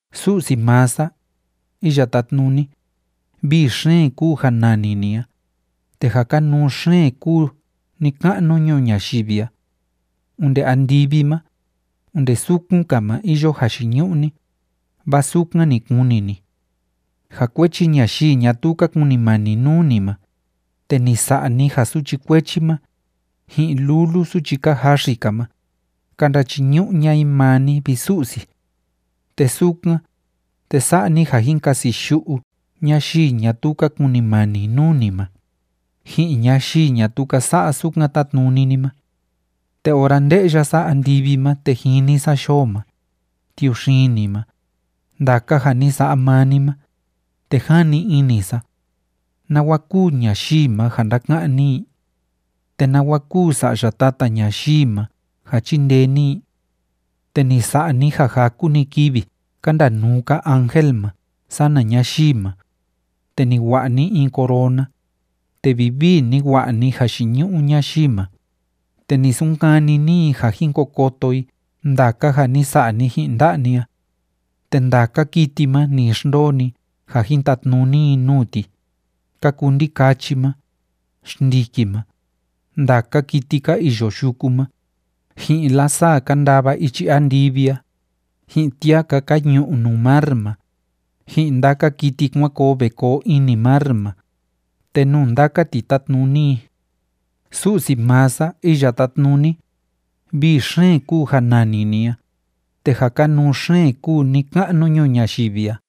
Su'si maa sa, Iya Tátnuni, vii xeen kúu ja nani ni a, te ja kanuu xeen kúu ni‑ka'nu ñuu ñayivi a. Onde andivi ma, onde sukun‑ka ma iyo jayiñu'u ni, vaa sukan ni kuni ni. Ja kuechi ñayii ñatuu ka kunimani nuu ni ma, te ni sa'a ni ja suchi kuechi ma, ji'in lulu suchi ka jaxi‑ka ma, ka ndachiñu'u ña'a i maa ni, vi Su'si. Te sukan, te sa'a ni ja jin kasiyu'u ñayii ñatuu ka kunimani nuu ni ma, ji'in ñayii ñatuu ka sa'a sukan tátnuni ni ma. Te ora nde'ya sa andivi ma te jini sa yoo ma, tiuxini ma, ndaka ja ni sa'a maa ni ma, te jani ini sa: ¿Nawa kúu ñayii ma, ja ndáka'an ni i? ¿Te nawa kúu sa'ya tata ñayii ma, ja chíndee ni i? Te ni sa'a ni ja jaku‑ni kivi ka ndanuu‑ka ángel ma sana ñayii ma, te ni wa'a ni in corona, te vivii ni wa'a ni jayiñu'u ñayii ma, te ni sunkani ni i ja jin ko koto i ndaka ja ni sa'a ni ji'in nda'a ni a. Te ndaka kiti ma ni xndoo ni ja jin tatnuni i nuu ti, ka kuu ndikachi ma, xndiki ma, ndaka kiti ka iyo yuku ma, ji'in lasaa ka ndava ichi andivi a, ji'in tiaka ka ñu'u nuu mar ma, ji'in ndaka kiti kuan koo ve koo ini mar ma, te nuu ndaka ti tátnuni i. Su'si maa sa, Iya Tátnuni, vii xeen kúu ja nani ni a, te ja kanuu xeen kúu ni‑ka'nu ñuu ñayivi a.